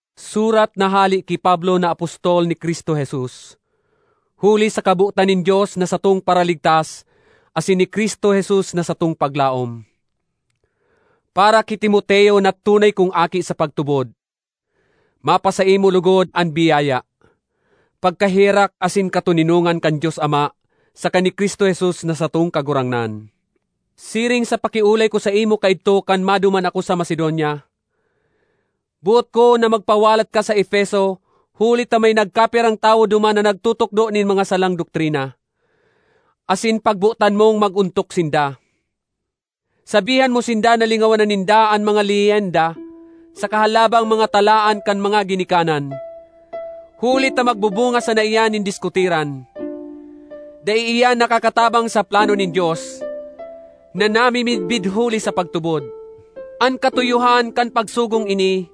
Surat na hale ki Pablo na apostol ni Cristo Jesus huli sa kabotan nin Dios na satong Paraligtas asin ni Cristo Jesus na satong paglaom. Para ki Timoteo na tunay kong aki sa pagtubod: Mapasaimo logod an biyaya, pagkaherak asin katoninongan kan Dios Ama saka ni Cristo Jesus na satong Kagurangnan. Siring sa pakiolay ko saimo kaidto kan maduman ako sa Macedonia, boot ko na magpawalat ka sa Efeso huli ta may nagkapirang tawo duman na nagtutukdo nin mga salang doktrina, asin pagbotan mong mag-ontok sinda. Sabihan mo sinda na lingawan na ninda ang mga leyenda saka halabang mga talaan kan mga ginikanan, huli ta magbubunga sana iyan nin diskutiran. Dai iyan nakakatabang sa plano nin Dios, na namimidbid huli sa pagtubod. An katuyohan kan pagsugong ini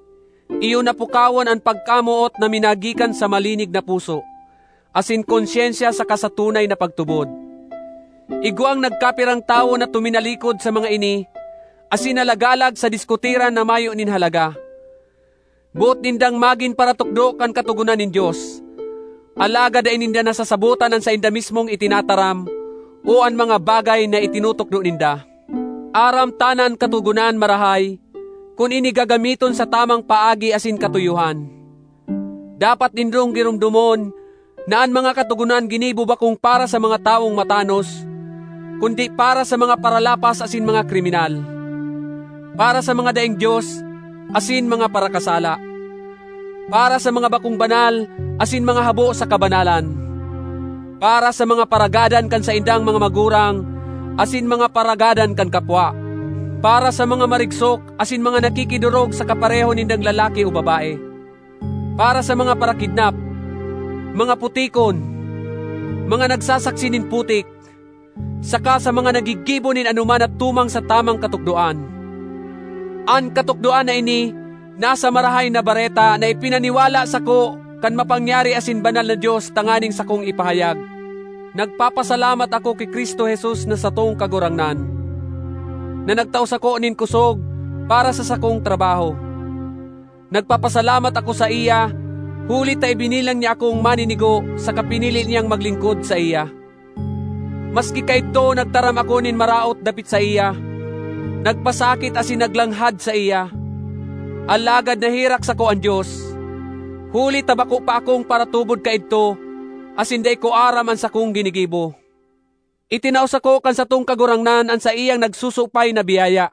iyo na pukawon an pagkamoot na minagikan sa malinig na puso asin konsyensya saka sa tunay na pagtubod. Igwang nagkapirang tawo na tuminalikod sa mga ini asin nalagalag sa diskutiran na mayo nin halaga. Boot nindang magin paratukdo kan katogonan nin Dios, alagad dai ninda nasasabotan an sainda mismong itinataram o an mga bagay na itinutukdo ninda. Aram ta na an Katogonan marahay, kun ini gagamiton sa tamang paagi asin katuyohan. Dapat nindong giromdomon na an mga katogonan ginibo bakong para sa mga tawong matanos, kundi para sa mga paralapas asin mga kriminal, para sa mga daing Dios asin mga parakasala, para sa mga bakong banal asin mga habo sa kabanalan, para sa mga paragadan kan saindang mga magurang asin mga paragadan kan kapwa, para sa mga marigsok asin mga nakikidorog sa kapareho nindang lalaki o babae, para sa mga parakidnap, mga putikon, mga nagsasaksi nin putik, saka sa mga naggigibo nin anoman na tumang sa tamang katukdoan. An katukdoan na ini nasa Marahay na Bareta na ipinaniwala sako kan mapangyari asin banal na Dios tanganing sakong ipahayag. Nagpapasalamat ako ki Cristo Jesus na satong Kagurangnan, na nagtao sako nin kosog para sa sakong trabaho. Nagpapasalamat ako saiya huli ta ibinilang niya akong maninigo saka pinili niyang maglingkod saiya, maski kaidto nagtaram ako nin maraot dapit saiya, nagpasakit asin naglanghad saiya. Alagad naherak sako an Dios, huli ta bako pa akong paratubod kaidto asin dai ko aram an sakong ginigibo. Itinao sako kan satong Kagurangnan an saiyang nagsusupay na biyaya,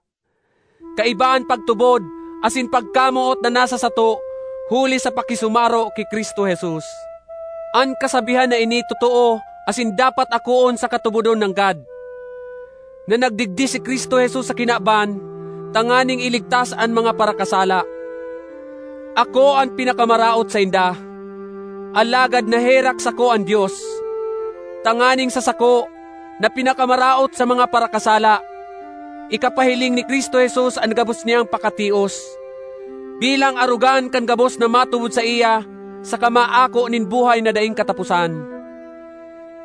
kaiba an pagtubod asin pagkamoot na nasa sato huli sa pakisumaro ki Cristo Jesus. An kasabihan na ini totoo asin dapat akoon saka tubodon nanggad: na nagdigdi si Cristo Jesus sa kinaban tanganing iligtas an mga parakasala. Ako an pinakamaraot sainda, alagad naherak sako an Dios, tanganing sa sako, na pinakamaraot sa mga parakasala, ikapahiling ni Cristo Jesus an gabos niyang pakatios, bilang arogan kan gabos na matubod saiya saka maako nin buhay na daing kataposan.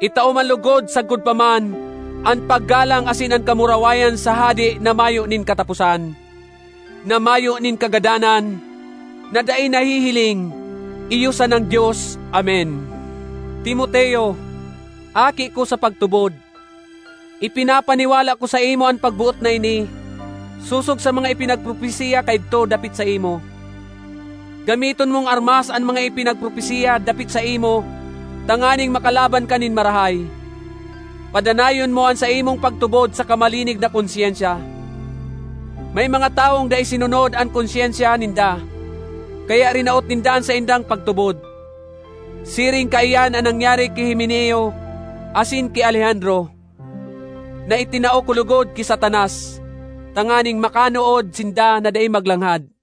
Itao man logod sagkod pa man an paggalang asin an kamurawayan sa Hade na mayo nin kataposan, na mayo nin kagadanan, na dai nahihiling, iyo sanang Dios! Amen. Timoteo, aki ko sa pagtubod, ipinapaniwala ko saimo an pagboot na ini sosog sa mga ipinagpropesiya kaidto dapit saimo. Gamiton mong armas an mga ipinagpropesiya dapit saimo tanganing makalaban ka nin marahay; padanayon mo an saimong pagtubod saka malinig na konsyensya. May mga tawong dai sinunod an konsyensya ninda, kaya rinaot ninda an saindang pagtubod. Siring kaiyan an nangyari ki Himeneo asin ki Alejandro, na itinao ko logod ki Satanas, tanganing makanood sinda na dai maglanghad.